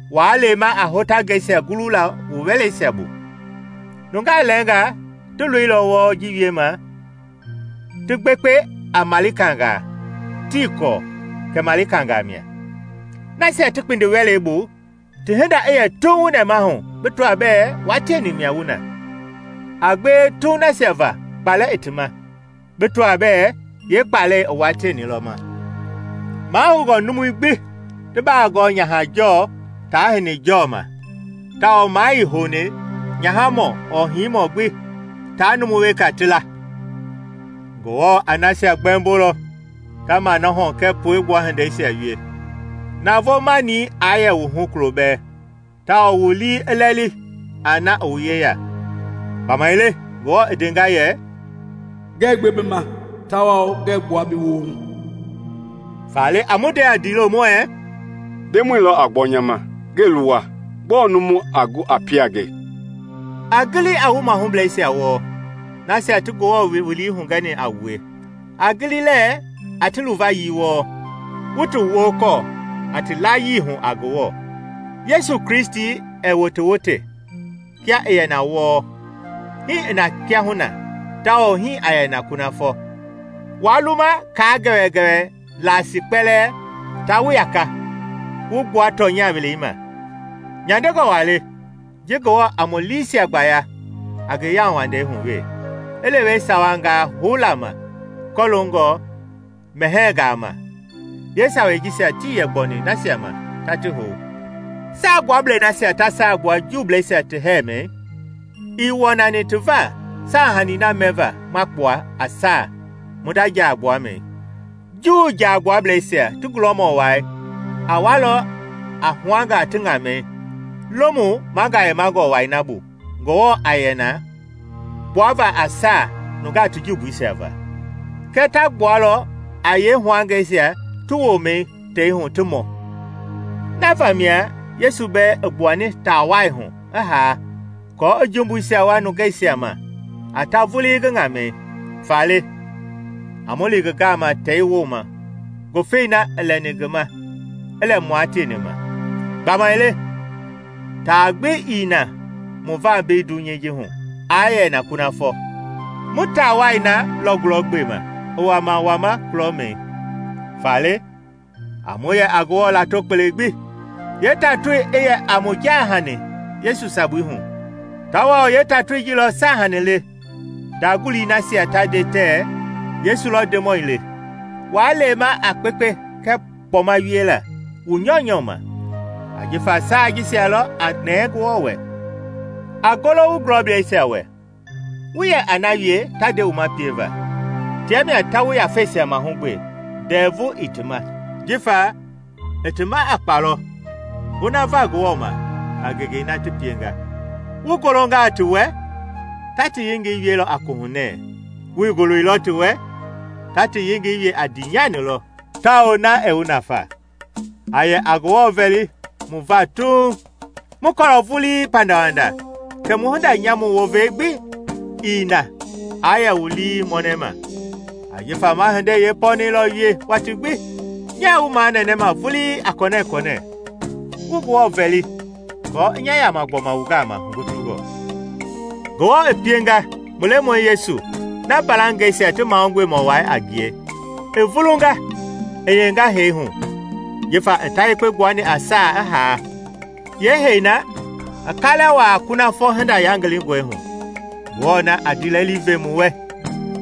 Waa lema a hotangɛisia gulula wu wɛleisia bu. Nunga lɛɛnga ti loilɔ wɔɔ ji wiema ti gbekpe a malikangaa tii kɔɔ kɛ malikangaa mia. Nasia ti kpindi wɛlei bu ti hinda i yɛ tuuŋ wu nɛmahu bi tɔa bɛɛ wua tieni mia wu na. A gbewe tuuŋ nasia va kpalɛ i ti ma bi tɔa bɛɛ yeekpalɛi i wua tieni lɔ ma. Mahoungɔ numui gbi ti baa gɔɔ nyaha-jɔɔ taa hini-jɔɔ ma, tawao maa ii houni nyahamɔ ɔɔ hinimɔ gbi taa numu weka ti la. Ngewɔ a nasia gbɛmbolɔ ta manɔhɔ kɛɛ puegbua hindeisia wie. Navoo-mani aa yɛ wu hu kulo bɛɛ, tawao wu lii i lɛli a na i wu yeya. Gbamaile Ngewɔ i ndenga yɛ, “Ngɛɛ gbe bi ma tawao ngɛɛ gbua bi woohu.” Faale, a mu nde a ndiilo muɛɛ, “Ndemɔi lɔ a gbɔ nya ma, ngɛɛ luwa. Gbɔɔ numu gbi a gu i pie a nge?” A gili a wu mahublɛisia wɔɔ, nasia ti Ngewɔ wowili hugɛni a wue. A gili lɛɛ a ti luvayii wɔɔ kɛɛ ti haayii, wu ti wokɔɔ a ti layii hu a Ngewɔ. Yesu Kristi ɛɛ wotewote, kia i yɛ na wɔɔ, hii i na kiahuna tawao hii a yɛ na kunafɔ. Waa luma kaa gɛwɛgɛwɛ laasii kpɛlɛɛ taa wu yaka wu gbua tɔnya welei ma; nyandengɔ waa le ji Ngewɔ a mu liisia gbaya a ngi yauwandei hu we, i lewe sawangaa houla ma kɔloongɔ mɛhɛɛngaa ma; yeesawei jisia tii yɛ gbɔni nasia ma ta ti hou. Saagbuablei nasia ta saa gbua Juubleisia ti hɛɛmɛi, ii wɔnani ti va saahanii na mɛva ma kpua a saa mu nda jaa gbuamɛi. Juu Jaagbuablɛisia ti gulɔmɔ wai a walɔ a huangaa ti ŋamɛi Lomu Magayemangɔ Wai na bu Ngewɔ a yɛ na kpuava a saa nungaa ti jumbuisia va; kɛɛ ta gbualɔ a yeehuangɛsia ti woomɛi tei hu ti mɔ. Na vamia Yesu bɛɛ i gbuani taa wai hu i haa aako i jumbuisia wua nungeisia ma a ta vulii ngi ŋamɛi. Faale, a mu li ngi gama tei wooma ngufei na i lɛni ngi ma i lɛ mua tieni ma. Gbamaile taa gbi ii na mu va mbei dunyei ji hu a yɛ na kunafɔ; mu taa wai na lɔ gulɔgbema i wama wama kulɔmɛi. Faale a mu yɛ a Ngewɔ lato kpele gbi, yeetatoi i yɛ a mu jaahani Yesu sabui hu, tawao yeetatoi ji lɔ saahanii le ndaguli nasia ta nde tɛɛ Yesu lɔ Ndemɔi le. Waa lema a kpekpe kɛɛ kpɔma wiela wu nyɔunyɔu ma, ajifa saa jisia lɔ a nɛɛ Ngewɔ wɛ. A golo wu gulɔbleisia wɛ, wu yɛ a na wie ta nde wu ma pieva. Tia mia ta wu yafeisia mahugbe ndɛvu ii ti ma, jifa i ti ma a kpa lɔ gonava Ngewɔ ma a ngengei na ti pienga. Wu golongaa ti wɛ, ta ti yengei wielɔ a kohunɛɛ; wuii goloilɔ ti wɛ, ta ti yengei wie a ndiinyani lɔ, tawao na ɛɛ wu nafa. A yɛ a Ngewɔ vɛli mu va tuuŋ. Mu kɔɔlɔ vulii pandawanda kɛ mu hinda nyamu wova gbi ii na aa yɛ wu lii mɔnɛma, ajifa ma hindei yeepɔnɛi lɔ wie watii gbi. Nyaa wu manɛnɛma vulii a kɔnɛkɔnɛ wu Ngewɔ vɛli kɔɔ i nya yama gbɔma wu gama hugutungɔ. Ngewɔ i pienga mu Lemɔi Yesu na mbalangɛisia ti Mahugbemɔ Wai a ngie i vulunga i hiyenga hee hu ajifa i ta yekpe gbuani a saa i haa, yeehɛi na i kalɛ wuaa kunafɔ hinda yangilingɔi hu. Ngewɔ na a ndiilɛli ve mu wɛ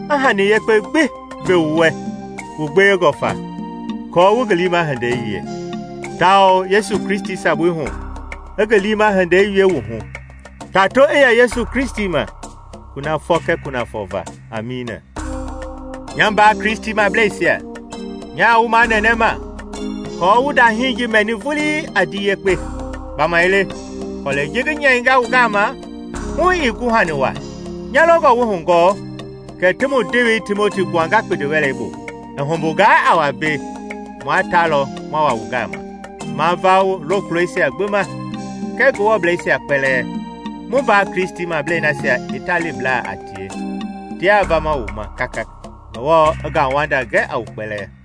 i hani yekpe gbi ve wu wɛ wu gbewengɔ fa aako wu ngi liima hindei wie, tawao Yesu Kristi sabui hu, i ngi liima hindei wie mu hu. Tato i yɛ Yesu Kristi ma kunafɔ kɛɛ kunafɔ va! Amiina. Nya mbaa Kristimableisia, nyaa wu manɛnɛma kɔɔ wu ndahii ji mɛni vulii a ndii yekpe; gbamaile kɔlɛi ji ngi nyɛinga wu gama hu ii guhani wa. Nya longɔ wu kɔɔ kɛ ti mu ndewei Timoti gbuanga kpindiwɛlei bu. I humbungaa a wa mbei, mua ta lɔ ma wa wu gama. Ma va wu lokulɔisia gbi ma kɛɛ Ngewɔbleisia kpɛlɛɛ. Mu mbaa Kristimablei nasia Italiblaa a tie tiaa vama wu ma kaka. Ngewɔ i ngauwanda gɛ a wu kpɛlɛɛ.